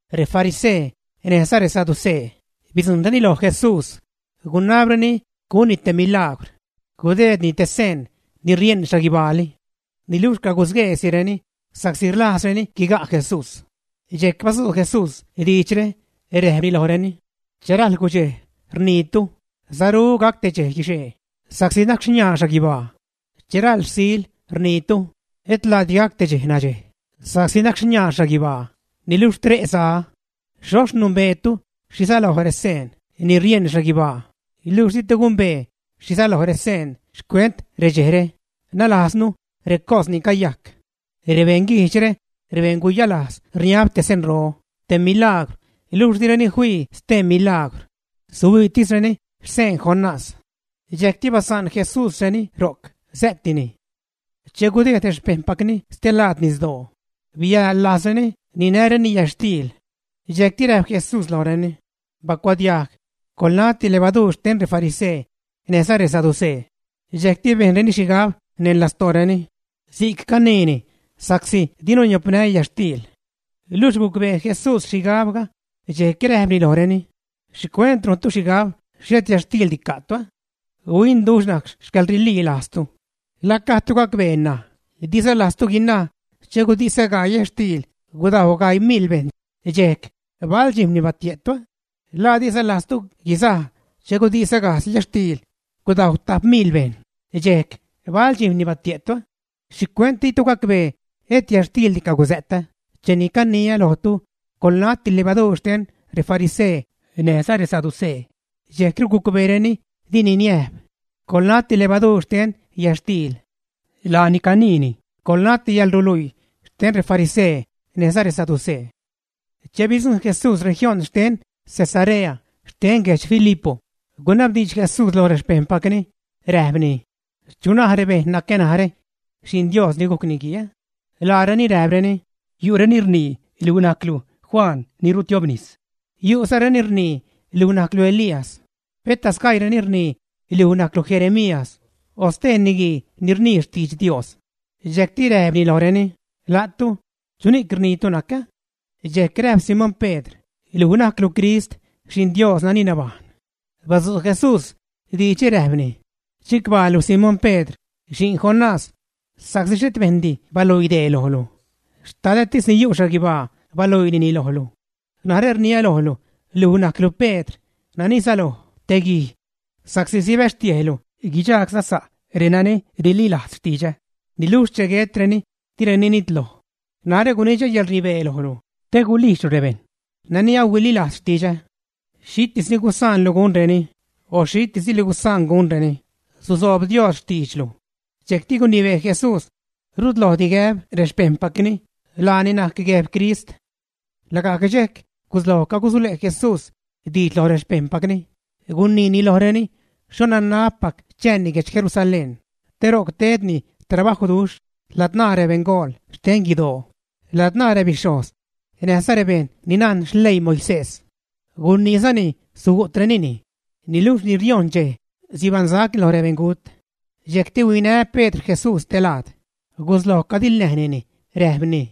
Refarisee näjza resaducee bidzujṉreni lo Jesús, gunabreni gunni te milagwr, gudeedni te seen ni rieṉ xhaguibaali. Niluxh cagusgueesireni, sa'csi rlajzreni guiga' Jesús. Dxejc badzu' Jesús diidxre räjpni lojreni: ―Che rajl gudxej, rniitu: “Saru gac te dxej guixee sa'csi naxniaa xhaguibaa.” Che rajl rsil rniitu: “Etlaadi gac te dxej nadxej sa'csi naxniaa xhaguibaa niluxh tre' za.” Xhoxh numbeetu xhi säloj reseen ni rieṉ xhaguibaa, luxh ditu gumbee xhi säloj reseen xcuent redxejre, nalajznu recos ni cayajc. Rebeṉ guijdxre, rebeṉ guyalajz rniab te senro, te milagwr, luxh dirureni fii stee milagwr; suhuiitisreni xsen Jonás. Dxejcti basa'n Jesúsreni ro'c, sä'tini. Che gudejd rexpejṉpacni stelaad nisdoo biäḻ-lajzreni ninäreni yätxtiil. Dxejcti räjp Jesús lojreni: ―Bacuadiajg, coḻnati levaduur xten refarisee näjza resaducee. Dxejcti bejnreni xhigab neṉ lastooreni: “Si'c caniini sa'csi dinu niopnä yätxtiil.” Luxh gucbee Jesús xhigabga, dxejc räjpni lojreni: ―¿Xhicuent rujntu xhigab xhet yätxtiildi ca'tu, ä? ¡Huinduxh najc xcäḻrililajztu! ¿La gajdtu gacbee? ¿La diza lajztu guinaj che gudisä gaii yätxtiil gudajw gaii miḻ bejṉ, ä? ¿Bal dxijm̲ni batie'tu, ä? ¿La diza lajztu guizaj che gudisä gajdz yätxtiil gudajw tap miḻ bejṉ, ä? ¿Bal dxijm̲ni batie'tu? ¿Xhicuent ditu gacbee et yätxtiildi cagusä'tä cheni caniä lojtu coḻnati levaduur xten refarisee näjza resaducee? Dxejcru gucbeereni dini niäjp: “Coḻnati levaduur xten yätxtiil.” Laani caniini: “Coḻnaáti yäḻruluii xten refarisee näjza resaducee.” Che bidzujṉ Jesús región xten Cesarea xten guedx Filipo, gunabdiidx Jesús loj rexpejṉpacni, räjpni: ―¿Chu naj rebejṉ nacä narä Xi'n Dios ni gujc Niguii? Laareni räjpreni: ―Yu'reni naj luj najclu Juan Bautist; yu'zareni rnii luj najclu Elías, peta sgaiireni rnii luj najclu Jeremías o stee niguii ni rnii xtidx Dios. Dxejcti räjpni lojreni: ―La'tu, ¿chuni'c rniitu nacä? Dxejc räjp Simón Pedr: ―Luj najclu Crist, Xi'n Dios nani nabajṉ. Badzu' Jesús diidxre, räjpni: ―Chicbaalu, Simón Pedr, xi'n Jonás, sa'csi xhet bejṉdi baluii dee lojlu, Xtadätis ni yu' xhaguibaa baluiinini lojlu. Narä rniä lojlu, luj najclu Pedr, nani säloj: “Te guij.” Sa'csi sibäxtiejlu guidxagsa'za renani rililajz xtidxä, niluxh che guetreni, direni nitloj. Narä gunidxä yäḻrnibee lojlu te gulijdxlu rebejṉ nani ahuiliilajz xtidxä. Xhitis ni gusaanlu gunreni, o xhitis ni dilu gusaan gunreni, susoob Dios xtiidxlu. Dxejcti gunibee Jesús rutlojdi gäb rexpejṉpacni laani najc Guejb Crist. Lagajc dxejc gusloj cagusule' Jesús diidx lo rexpejṉpacni, guniini lojreni xho nanabpac chääni guedx Jerusalén te ro'c tedni trabajwduxh ladzṉaa rebeṉgool xten guidoo, ladzṉaa rebixhojz, näjza rebejṉ ni najn xleii Moisés. Guniizani sugu'trenini, niluxh ni riojṉ dxej sibaṉsacni lo rebeṉgut. Dxejcti huinä Pedr Jesús te laad, gusloj cadiḻnäjnini, räjpni: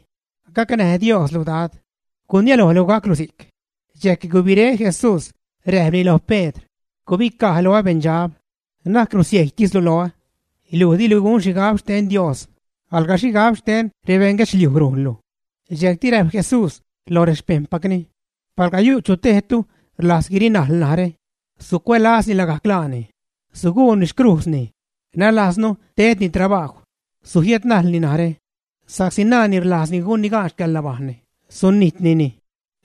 ―¡Gacnäj Dioslu, Dad! ¡Gurniälojlu gaclu si'c! Dxejc gubiré Jesús, räjpni lo Pedr: ―¡Gubicaj loä beṉdxab! Na'c rusiejytislu loä. Luj dilu gun xhigab xten Dios, alga xhigab xten rebeṉguedxliuj rujnlu. Dxejcti räjp Jesús loj rexpejṉpacni: ―Palga yu' chu tejtu rlajz guirinajl narä, sucuälazni lagajc laani, suguuni xcrujzni, nalajznu tedni trabajw, sujiädnajlni narä. Sa'csi nani rlajz gunni gaan xcäḻnabajṉni, sunijtnini.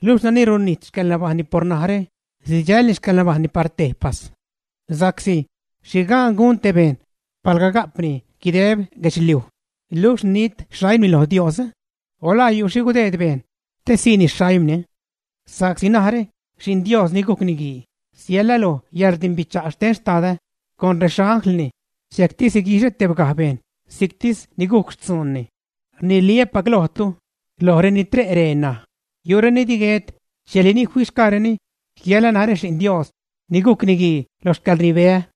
Luxh nani runijt xcäḻnabajṉni por narä, sidxälni xcäḻnabajṉni par tejpas. Sa'csi ¿xhi gaan gun te bejṉ palga ga'pni guideb guedxliuj, luxh nit xaimni lo Dios, ä? o ¿la yu' xhi gudeed bejṉ te siini xaimni? Sa'csi narä Xi'n Dios ni gujc Niguii siälä lo yäḻrdimbicha' xten Xtadä con rexanglni, dxejcti siguixä tebgaj bejṉ si'ctis ni gujc xtzuunni. Rniliä́pac lojtu, loj reni tre' ree ṉaj, yu'reni di guet dxejli ni fixgaareni jiälä narä Xi'n Dios ni gujc Niguii lo xcäḻrnibeä.